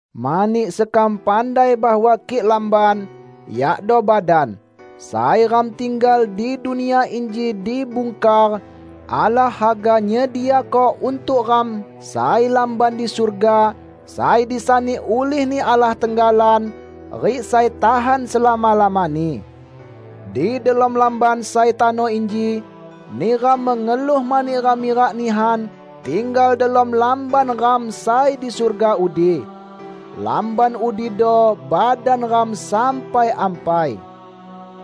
Mani sekam pandai bahwa kik lamban -- yakdo badan -- sai ram tinggal di dunia inji dibungkar, Allah haga nyediako untuk ram sai lamban di surga, sai disani ulih-Ni Allah tenggalan rik sai tahan selama-lamani. Di delom lamban sai tano inji, neram mengeluh mani ram mirak nihan tinggal delom lamban ram sai di surga udi. Lamban udido badan ram sai ampai.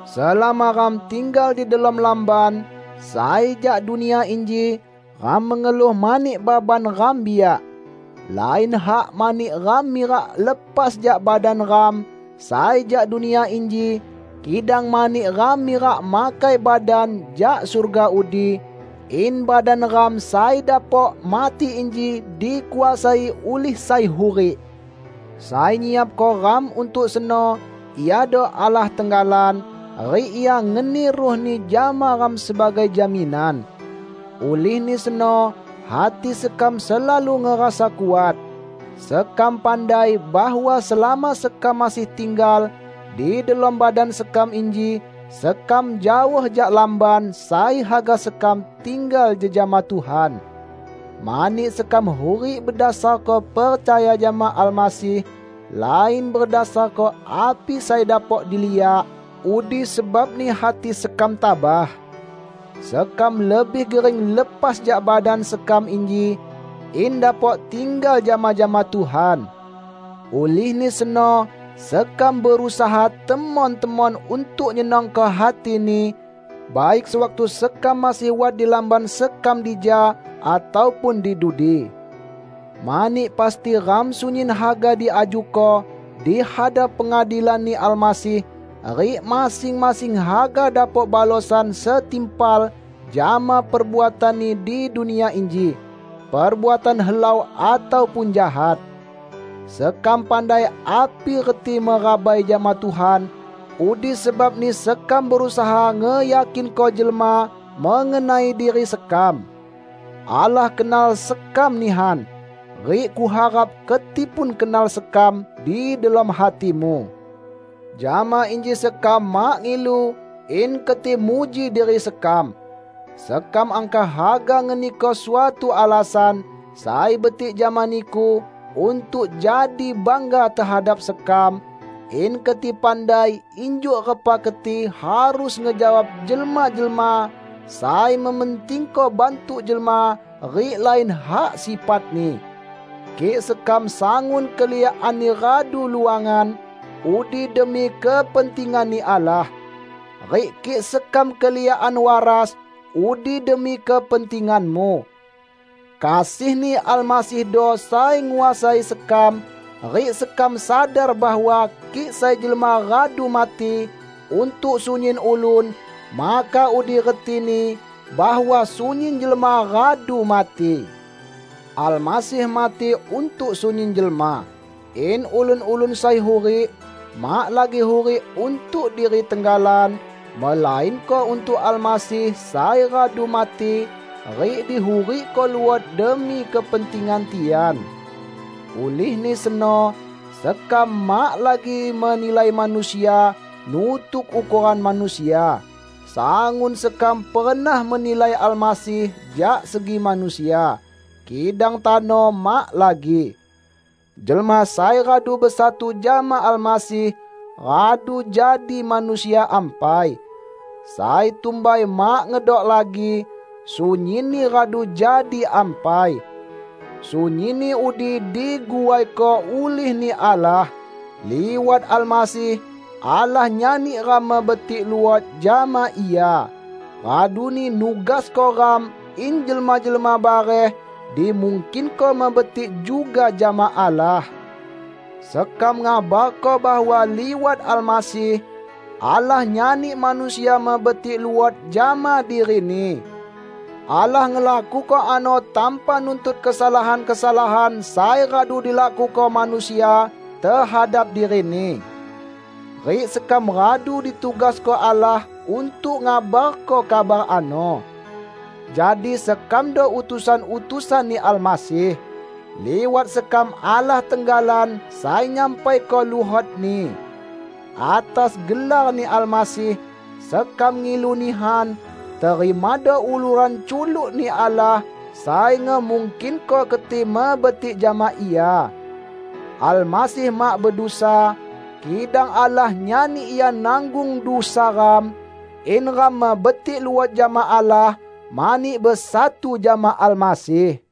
Selama ram tinggal di delom lamban sai jak dunia inji, ram mengeluh mani baban ram biak. Lain hak mani ram mirak lepas jak badan ram sai jak dunia inji, kidang mani ram mirak makai badan jak surga udi, in badan ram sai dapok mati inji dikuasai ulih sai hurik. Sai nyiapko ram untuk seno iado Allah tenggalan, rik Ia ngeni Ruh-Ni jama ram sebagai jaminan. Ulihni seno hati sekam selalu ngerasa kuat. Sekam pandai bahwa selama sekam masih tinggal di delom badan sekam inji, sekam jaoh jak lamban sai haga sekam tinggal jejama Tuhan. Mani sekam hurik bedasarko percaya jama Almasih, lain bedasarko api sai dapok diliak, udi sebabni hati sekam tabah. Sekam lebih gering lepas jak badan sekam inji, in dapok tinggal jama-jama Tuhan. Ulihni seno sekam berusaha temon-temon untuk nyenangko hati-Ni, baik sewaktu sekam masih wat di lamban sekam dija, ataupun di dudi. Mani pasti ram sunyin haga diajuko di hadap pengadilan-Ni Almasih, rik masing-masing haga dapok balosan setimpal jama perbuatanni di dunia inji -- perbuatan helau ataupun jahat. Sekam pandai api reti merabai jama Tuhan; udi sebabni sekam berusaha ngeyakinko jelma mengenai diri sekam. Allah kenal sekam nihan, rik kuharap keti pun kenal sekam di delom hatimu. Jama inji sekam mak ngilu in keti muji diri sekam. Sekam angkah haga ngeniko suatu alasan sai betik jama niku untuk jadi bangga tehadap sekam, in keti pandai injuk repa keti harus ngejawab jelma-jelma sai mementingko bantuk jelma rik lain hak sifatni. Kik sekam sangun keliakanni radu luangan, udi demi kepentingan-Ni Allah. Rik kik sekam keliakan waras, udi demi kepentinganmu. Kasih-Ni Almasihdo sai nguasai sekam; rik sekam sadar bahwa kik sai jelma radu mati untuk sunyin ulun, maka udi retini bahwa sunyin jelma radu mati. Almasih mati untuk sunyin jelma, in ulun-ulun sai hurik, mak lagi hurik untuk diri tenggalan, melainko untuk Almasih sai radu mati rik dihurikko luot demi kepentingan tian. Ulihni seno, sekam mak lagi menilai manusia nutuk ukoran manusia. Sangun sekam pernah menilai Almasih jak segi manusia, kidang tano mak lagi. Jelma sai radu besatu jama Almasih, radu jadi manusia ampai. Sai tumbai mak ngedok lagi -- sunyinni radu jadi ampai. Sunyinni udi diguaiko ulih-Ni Allah. Liwat Almasih Allah nyani ram mebetik luot jama Ia, raduni nugasko ram in jelma-jelma bareh dimungkinko mebetik juga jama Allah. Sekam ngabarko bahwa liwat Almasih, Allah nyani manusia mebetik luot jama diri-Ni. Allah ngelakuko ano tanpa nuntut kesalahan-kesalahan sai radu dilakuko manusia tehadap diri-Ni. Rik sekam radu ditugasko Allah untuk ngabarko kabar ano. Jadi sekamdo utusan-utusan-Ni Almasih. Liwat sekam Allah tenggalan sai nyampaiko luhot-Ni. Atas gelar-Ni Almasih, sekam ngilu nihan, terimado uluran culuk-Ni Allah sai ngemungkinko keti mebetik jama Ia. Almasih mak bedusa, kidang Allah nyani Ia nanggung dusa ram, in ram mebetik luot jama Allah mani besatu jama Almasih.